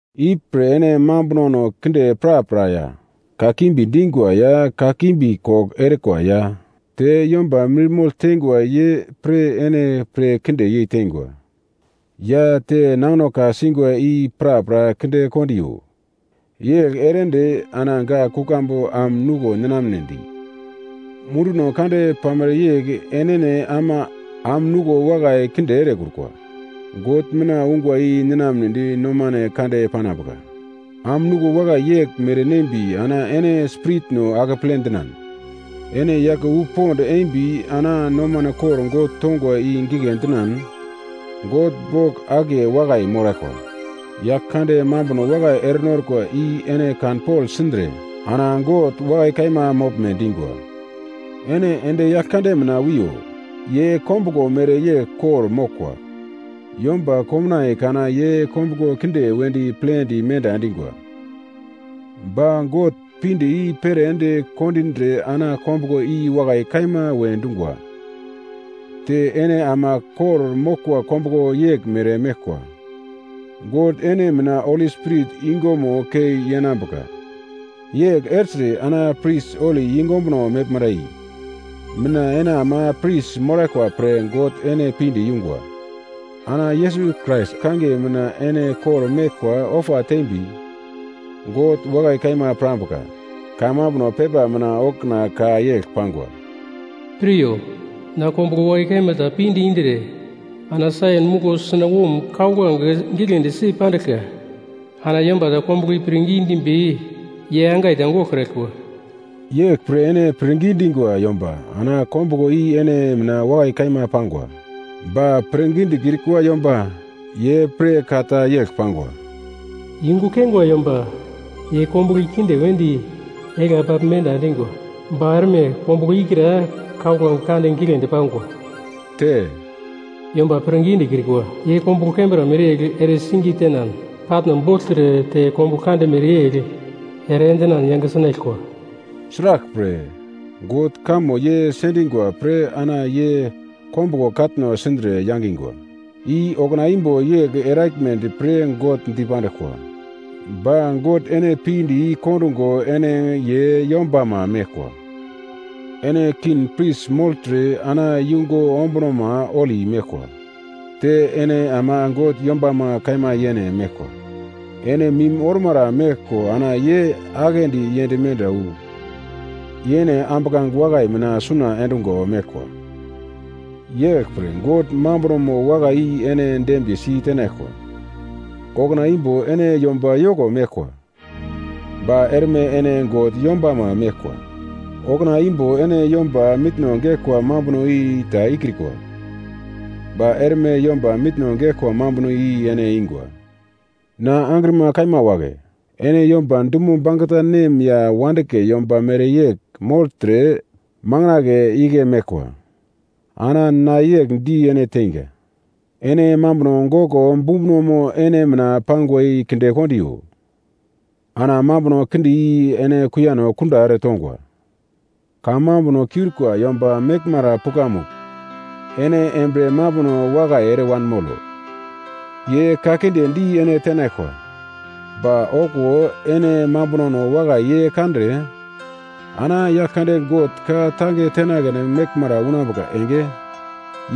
Ipre ene mambunono kinde prapra ya kakimbi dingwa ya kakimbi kogl erikwa ya te yomba mirmogl teingwa ye pre ene pir kinde yeiteingwa ya te nangino ka-singwa i prapra kinde kondiyo. Yegl ere ende, ana gak kuglambu am nuglo ninamnedi munduno kande pamere yegl enene ama am nuglo wakai kinde erekrukwa God mina ungwa i ninamnedi nomano kande panambuka. Am nuglo wakai yeglmere nembi ana ene spiritno akeple dinan ene yake wu pond embi ana nomano kor God tongwa i gigle dinan God bogl akiye wakai moraglkwa. Yaglkande mambuno wakai erenorkwa i ene kanpogl sindre ana God wakai kaima moglme dingwa. Ene ende Yaglkande mina wiyo. Ye kombuglo mereyegl kor-moglkwa. Yomba komnaiye kana ye kombuglo kinde wedi plendi menda endingwa. Ba God pinde i-pere ende kondindre ana kombuglo i wakai kaima we dungwa. Te ene ama kor-moglkwa kombuglo yeglmere meglkwa, God ene mina Holi spirit yungumo kei yenambuka. Yegl ertre ana pris holi yungu ombuno meglmara i mina ene ama pris moraglkwa pre God ene pinde yungwa. Ana Yesus Krais kangiye mina ene kor-meglkwa ofa tembi God wakai kaima pirambuka. Kamambuno pepa mina okuna ka yegl pangwa: “Piryo, na kombuglo wakai kaima ta pinde indre ana Saion muglo sunawom kauglange giglendi si pandiglka. Ana yomba ta kombuglomo i pirngi dimbi ye angai ta goglkraglkwa.” Yeglpre ene pirngi dingwa yomba ana kombuglo i ene mina wakai kaima pangwa. Ba pirngi dikrikwa yomba ye pre ka ta yegl pangwa: “Yungu keingwa yomba ye kombuglo i kinde wedi egla pagl menda endingwa, ba erme kombuglo ikra kauglange kande giglendi pangwa.” Te, “Yomba pirngi dikrikwa, ye kombuglo kembra mereyegl ere singe tenan katno bogltre te kombuglo kande mereyegl ere endinan yange sinaglkwa.” Sraglpre, God kamo ye sendingwa pre ana ye kombuglo katno sindre yangingwa, i okuna imbo yegl eraglmedi pre God dipanduglkwa. Ba God ene pinde i-kondungo ene ye yombama meglkwa. Ene king pris mogltre ana yungu ombunomo holi meglkwa. Te ene ama God yombama kaima yene meglkwa. Ene mim ormara meglko ana ye aglendi yend menda wu yene ambuglange wakai mina suna endungo meglkwa. Yeglpre God mambunomo wakai i ene dembiye si tenaglkwa. Okuna imbo ene yomba yoko meglkwa, ba erme ene God yombama meglkwa. Okuna imbo ene yomba mitno geglkwa mambuno i ta ikrikwa, ba erme yomba mitno geglkwa mambuno i ene ingwa. Na angrima kaima wagle, ene yomba dumo bangeta nem ya wandigle yomba mereyegl mogltre makandle igle meglkwa. Ana na yegl di ene teinga. Ene mambuno goglo bumbunomo ene mina pangwa i kindekondiyo, ana mambuno kinde i ene kuiyano kunda eretongwa. Kamambuno kiurikwa yomba meglmara pukamugl ene embriye mambuno wakai ere wanmolo, ye ka kinde di ene tenaglkwa, ba okuwo ene mambunono wakai ye kandre, ana Yaglkande God ka-tange tenagledi meglmara unambuka enge,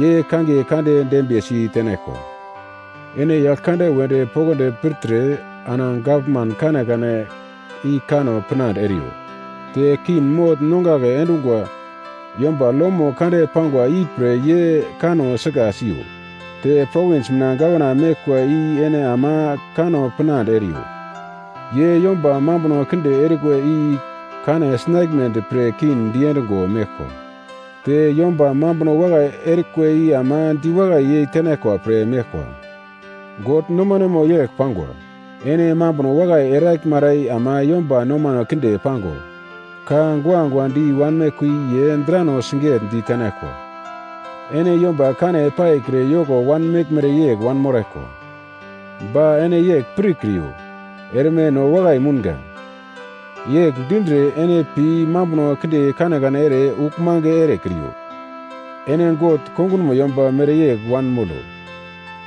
ye kangiye kande dembiyesi tenaglkwa. Ene Yaglkande wedi poglodi pirtre, ana gavman kanekane i kanno pinande eriyo. Te king mogl nongagle endungwa yomba lomo kande pangwa ipre ye kanno sika siyo. Te provins mina gavana meglkwa i ene ama kanno pinande eriyo, ye yomba mambuno kinde erikwa i kane sinaglmedi pre king diendigo meglkwa, te yomba mambuno wakai erikwa i ama diwakai yeitenaglkwa pre meglkwa. God nomanemo yegl pangwa: Ene mambuno wakai eraglmara i ama yomba nomano kinde pango ka guagua di wanmeglkwa i ye drano sigigle di tenaglkwa. Ene yomba kane paikre yoko wanmeglmere yegl wanmoraglkwa, ba ene yegl pirkriyo, “Erme no wakai mounga.” Yegl dindre, ene pi mambuno kinde kanekane ere uglmange erekriyo. Ene God kongunmo yomba mereyegl wanmolo.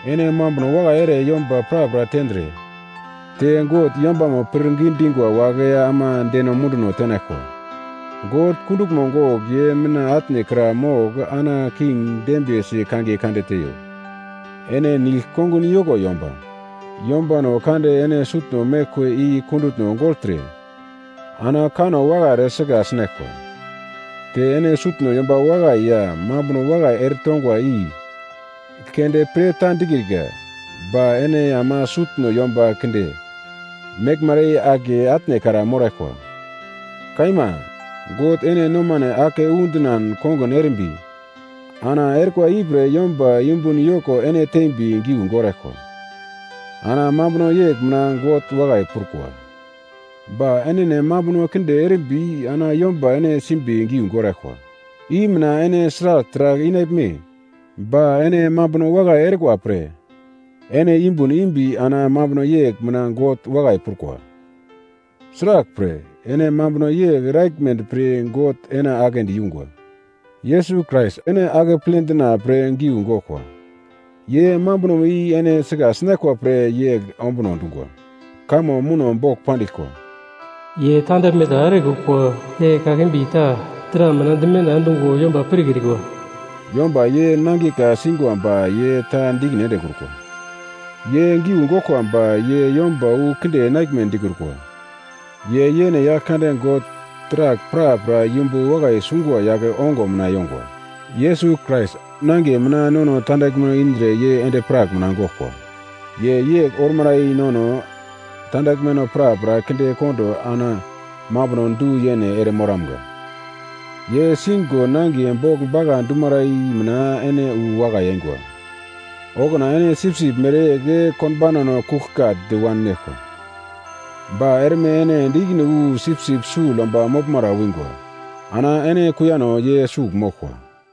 Ene mambuno wakai ere yomba prapra tendre te God yombama pirngi dingwa wagle ama deno munduno tenaglkwa. God kunduglmo gogl ye mina atnekra mogl ana king dembiyesi kangiye kande teiyo. Ene nigl-kongun yoko yomba, yombano kande ene sutno meglkwa i kundutno gogltre ana kanno wakai ere sika sinaglkwa. Te ene sutno yomba wakai ya mambuno wakai ere tongwa i keunde pre ta dikrika, ba ene ama sutno yomba kinde meglmara i akiye atnekra moraglkwa. Kaima, God ene nomane ake undinan kongun erimbi, ana erikwa ipre yomba yumbun yoko ene tembi giu goraglkwa, ana mambuno yegl mina God wakai prukwa. Ba enene mambuno kinde erimbi ana yomba ene simbi giu goraglkwa i mina ene sragl taragl inaglme? Ba ene mambuno wakai erikwa pre ene yumbun imbi ana mambuno yegl mina God wakai prukwa. Sraglpre, ene mambuno yegl eraglmedi pre God ene agle di yungwa. Yesus Krais ene akeple dina pre giu goglkwa. Ye mambunomo i ene sika sinaglkwa pre yegl ombuno dungwa. Kamo muno bogl pandiglkwa: “Ye tandaglme ta erekrukwa te kakimbi ta dra mina dimenda endungo yomba pirkrikwa.” Yomba ye nangiye ka-singwa ba ye ta di ikine endekrukwa. Ye giu goglkwa ba ye yomba wu kinde enaglme dikrukwa. Ye yene Yaglkande God taragl prapra yumbu wakai sungwa yagle ongo mina yongwa. Yesus Krais nangiye mina nono tandaglmeno indre ye endi-prak mina goglkwa. Ye yegl ormara i nono tandaglmeno prapra kinde kondo ana mambuno du-yene ere moramga. Ye sigo nangiye bogl bagla dumara i mina ene wu wakai eingwa. Okuna ene sipsip mereyegl konbaunano kuglkagldi wanmeglkwa, ba erme ene ende ikine wu sipsip sugl yomba moglmara wingwa ana ene kuiyano ye sugl moglkwa.